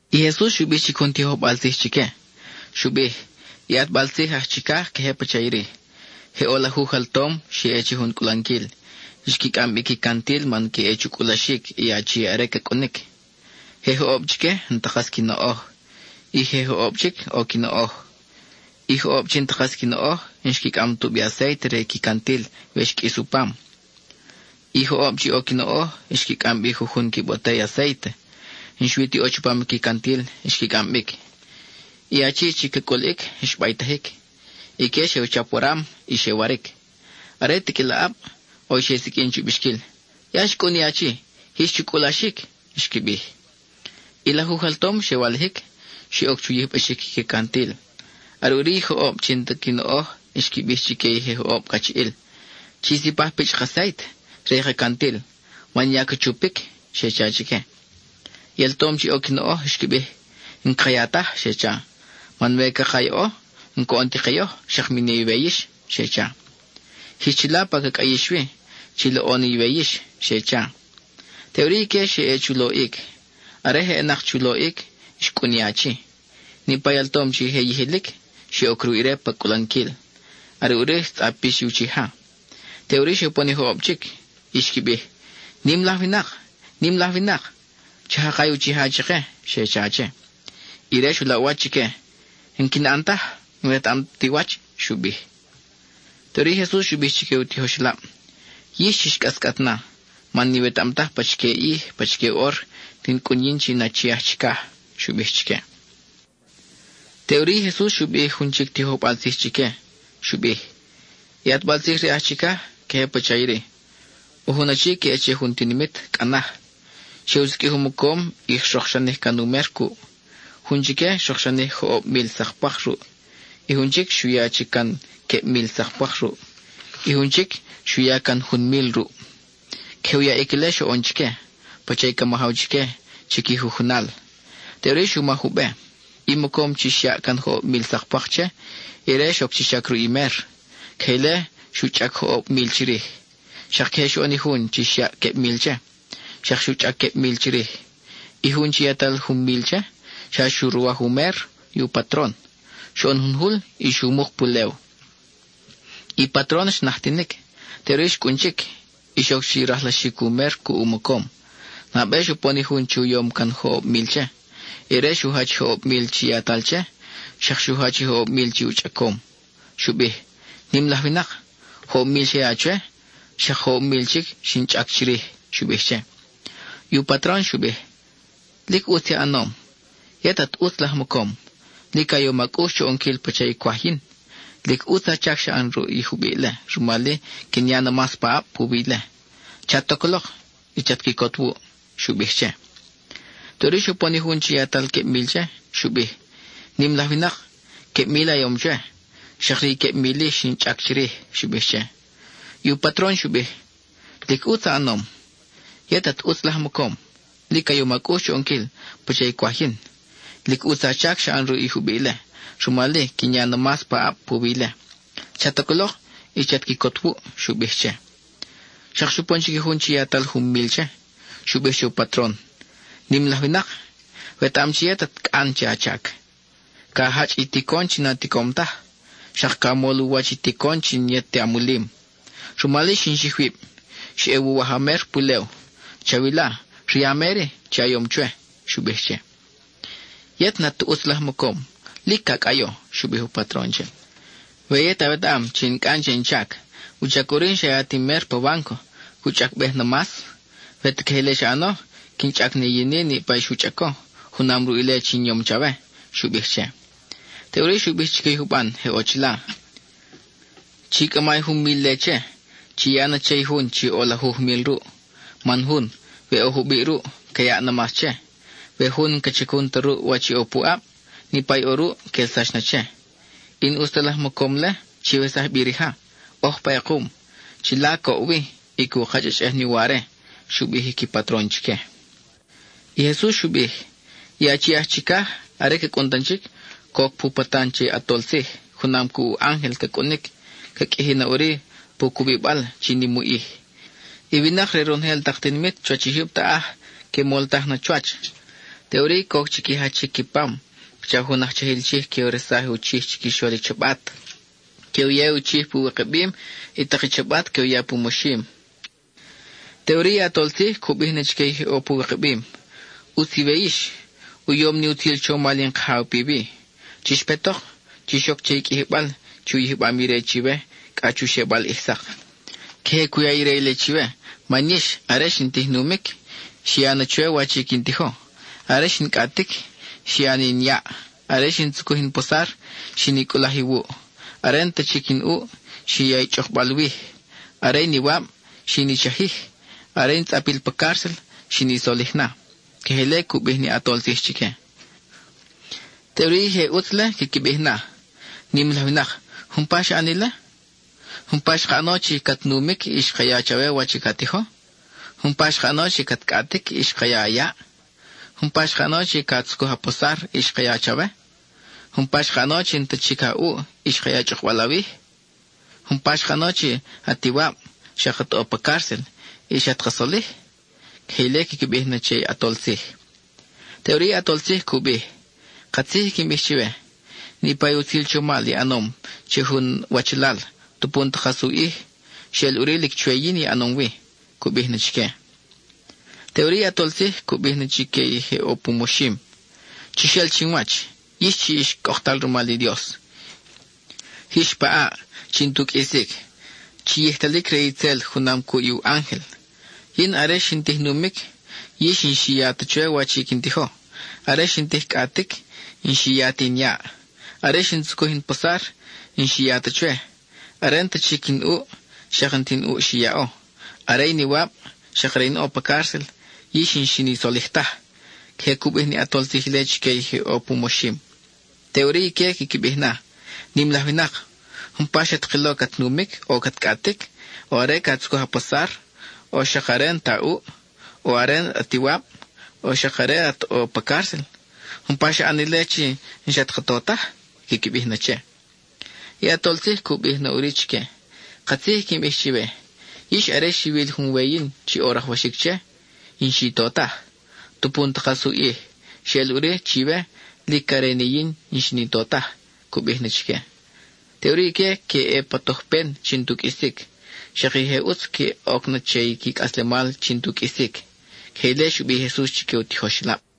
(I Jesus xu bij chic jun tijojbal tzij chique.) Xu bij: I ʼatbal tzij aj chicaj queje pacha iri: Je ʼo lajuj altom xe ʼe che jun cʼulanquil. Xqui cʼam bi qui cantil man que ʼe chu cʼulaxic i achi are ca cʼunic. Je joʼob chique n-ta kas qui noʼoj; i je joʼob chic ʼo qui noʼoj. I joʼob chi n-ta kas qui noʼoj, n-xqui cʼam tubi acéite re i qui cantil we xqʼuis u pam. I joʼob chi ʼo qui noʼoj xqui cʼam bi jujun qui botey acéite, n-xui ti ʼo chupam i qui cantil xqui cʼam bic. I achi chi ca cʼuliʼic xbaytajic. Ique xe u chap waram, y xe waric. Are tiqʼuil aʼab, ʼo i xe siqʼuin chu bixquil: “¡Ya xcʼun i achi; jix chu cʼulaxic!” xqui bij. I lajuj altom xe walijic, xe oc chu yijbaxic qui cantil. Are ʼuri i joʼob chi n-ta qui noʼoj xqui bij chique i je joʼob cachiʼil: “Chi sipaj pichʼ ka acéite re i ka cantil, man ya ca chupic,” xe cha chique. I altom chi ʼo qui noʼoj xqui bij: “N-caka ya taj,” xe cha. “Man we caka yaʼo, n-coʼon ti ke yoj, xak mi ne iwe yix,” xe cha. “Jix chila pa ca cʼayix wi; chi loʼo na iwe yix,” xe cha. Teʼuri ique xe ʼe chu loʼic; are je ʼenak chu loʼic, xcʼun i achi. Niʼpa i altom chi je yijilic, xe oc ruʼ ire pa cʼulanquil, are ʼuri xtzʼapix i uchija. Teʼuri xe upon i joʼob chic, y xqui bij: “¡Nim laj winak! ¡Nim laj winak! ¡Cha jaka i uchija chake!” xe cha che. Ire xu laʼ u wach chique: “N-quin ʼan taj; n-wetaʼam ta i wach,” xu bij. Teʼuri i Jesus xu bij chique u tijoxelab: —Yix, chix cʼascʼat na, man n-iwetaʼam taj pachique ʼij, pachique ʼor, quin cʼun yin chi in Achi aj Chicaj —xu bij chique. (Teʼuri i Jesus xu bij jun chic tijojbal tzij chique. Xu bij): —I ʼatbal tzij re aj chicaj, queje pacha iri: ʼO jun achi ca ʼe che jun tinimit cʼa naj; xe u siqʼuij u mocom y xrokxanij can u mer cuʼ. Jun chique xrokxanij joʼob mil sak pwak ruʼ. Y jun chic, xu ya chic can queb mil sak pwak ruʼ; y jun chic, xu ya can jun mil ruʼ. Queje u yaʼic ile xoʼon chique, pacha i ca majaw chique chi qui jujunal. Teʼuri xu maj u be. I mocom chi xyaʼ can joʼob mil sak pwak che, ire xoc chi chac ruʼ i mer. Queje ile xu chʼac joʼob mil chirij. Xak queje xoʼon i jun chi xyaʼ queb mil che: xak xu chʼac queb mil chirij. I jun chi yatal jun mil che, xa xu ruwaj u mer i u patron; xoʼon jun jul y xu muk pulew. I patron xnajtinic; teʼuri xcʼun chic, y xoc chi rajlaxic u mer cuʼ u mocom. Nabe xupon i jun chi u yom can joʼob mil che. Ire xu jach i joʼob mil chi yatal che, xak xu jach i joʼob mil chi u chʼacom. Xu bij: “Nim laj winak, joʼob mil xa ya chwe, xak joʼob mil chic xin chʼac chirij,” xu bij che. I u patron xu bij: “Lic ʼutz i a ʼanom. Yet at ʼutz laj mocom; lic a yom a cʼux chu ʼonquil pacha i cwaj yin. Lic ʼutz a chac xa ʼan ruʼ i jubiʼ-le, rumal-i, quin ya na mas paʼab puwi ile. Chat oc lok, y chat quicot wuʼ,” xu bij che. Teʼuri xupon i jun chi yatal queb mil che, Xu bij: “Nim laj winak, queb mil a yom chwe, xak ri i queb mil-i xin chʼac chirij,” xu bij che. I u patron xu bij: “Lic ʼutz i a ʼanom. Yet at ʼutz laj mocom; lic a yom a cʼux chu ʼonquil pacha i cwaj yin. Lic ʼutz a chac xa ʼan ruʼ i jubiʼ-le, rumal-i, quin ya na mas paʼab puwi ile. Chat oc lok, y chat quicot wuʼ,” xu bij che. Xak xupon chic i jun chi yatal jun mil che. Xu bij che u patron: “Nim laj winak, wetaʼam chi yet at cʼan che a chac; ca jachʼ i ticon chi na ticom taj, xak ca mol u wach i ticon chi n-yet ti a mulim. Rumal-i xin xij wib; xeʼe wuwaj a mer pulew. Chawila, ri a mer-i chi a yom chwe,” xu bij che. “Yet n-at ta ʼutz laj mocom; lic ca cʼayo,” xu bij u patron che. “We yet awetaʼam chi in cʼan che in chac, ¿wuchac ʼuri n-xa ya ti in mer pa bánco, cu chʼacbej na mas? We ta queje ile xa ʼano, quin chʼac ni yin-i niʼpa i xu chʼaco junam ruʼ ile chi in yom chawe,” xu bij che. Teʼuri xu bij chique i juban je ʼo chila, “Chi cʼama i jun mil-le che; chi ya na che i jun chi ʼo lajuj mil ruʼ. Man jun, we ʼo jubiʼ ruʼ, ca yaʼ na mas che; we jun n-ca chacun ta ruʼ wach ʼo puʼab, niʼpa i ʼo ruʼ quelsax na che. I n-ʼus ta laj mocom-le, chiwesaj bi rija; ʼoj pa ʼekum. Chila coʼ wi, y cu kachʼachʼej ni uware,” xu bij i qui patron chique. (I Jesus xu bij:) I Achi aj Chicaj, are ca cʼun tan chic, coc pu patan che ʼatol tzij; junam cuʼ u ángel ca cʼunic. Ca qʼuiji na ʼuri pu cubibal chi nim u ʼij. I winak re ronojel tak tinimit chuwach i jyub taʼaj que moltaj na chuwach. Teʼuri coc chi qui jachic qui pam, pacha jun aj chajil chij que u resaj u chij chiquixol i chabat. Que u ya i u chij pu wikabim; i tak i chabat que u ya pu moxim. Teʼuri i ʼAtol Tzij cu bij na chique i je ʼo pu wikabim: “ʼUtz iwe yix; u yom ni utzil chomal in Kajaw piwi. Chix petok, chix oc che i qʼuijibal chi u yijbam ire chiwe cʼa chu xebal ʼij sak. Queje cu ya ire ile chiwe man yix, are xin tij numic, xi ya na chwe wach i quin tijo; are xin cʼatic, xi ya ni in yaʼ; are xin tzucuj in posar, xin i cʼulaj iwuʼ. Are n-ta chic in ʼuʼ, xi ya i chʼukbal wij; are in iwab, xin i chajij; are in tzʼapil pa cárcel, xin i solij na.” Queje ile cu bij ni ʼAtol Tzij chique. Teʼuri, i je ʼutz-le quiqui bij na: “Nim laj winak, ¿umpa xa ʼan ile? ¿Umpa xka ʼano chi cat numic, y xka ya chawe wach ca tijo? ¿Umpa xka ʼano chi cat cʼatic, y xka ya a yaʼ? ¿Umpa xka ʼano chi ca tzucuj a posar y xka ya chawe? ¿Umpa xka ʼano chi n-ta chic a ʼuʼ, y xka ya chʼukbal awij? ¿Umpa xka ʼano chi at iwab, xak at ʼo pa cárcel, y xat ka solij?” Queje ile quiqui bij na che i ʼAtol Tzij. Teʼuri i ʼAtol Tzij cu bij: “Katzij i quin bij chiwe, niʼpa i utzil chomal i ʼanom che jun wachalal, tupu n-ta kas u ʼij, xeʼel ʼuri lic chwe yin i ʼanom wi,” cu bij na chique. Teʼuri i ʼAtol Tzij cu bij na chique i je ʼo pu moxim: “Chix el chi chinwach, yix chi ix cʼoktal rumal i Dios. Jix pa ʼaʼ chi n-tu qʼuisic, chi yijtalic re itzel junam cuʼ i u ángel. Yin, are xin tij numic, yix n-xi ya ta chwe wach i quin tijo; are xin tij cʼatic, n-xi ya ta in yaʼ. Are xin tzucuj in posar, n-xi ya ta chwe. Are n-ta chic in ʼuʼ, xak n-ta in ʼuʼ xi yaʼo. Are in iwab, xak are in ʼo pa cárcel, yix n-xin i solij taj.” Queje cu bij ni ʼAtol Tzij ile chique i je ʼo pu moxim. Teʼuri ique quiqui bij na: “Nim laj winak, ¿umpa xat kilo cat numic, o cat cʼatic, o are ca tzucuj a posar, o xak are n-ta a ʼuʼ, o are at iwab, o xak are at ʼo pa cárcel? ¿Umpa xa ʼan ile chi n-xat ka to taj?” quiqui bij na che. I ʼAtol Tzij cu bij na ʼuri chique: “Katzij i quin bij chiwe: yix are xiwil jun we yin chi ʼo rajwaxic che, y n-xi to taj, tupu n-ta kas u ʼij, xeʼel ʼuri chiwe lic are ni yin chi n-xin i to taj,” cu bij na chique. Teʼuri ique que ʼe pa tojpen chi n-tu qʼuisic; xak i je ʼutz que oc na che i qui cʼaslemal chi n-tu qʼuisic. (Queje ile xu bij i Jesus chique u tijoxelab.)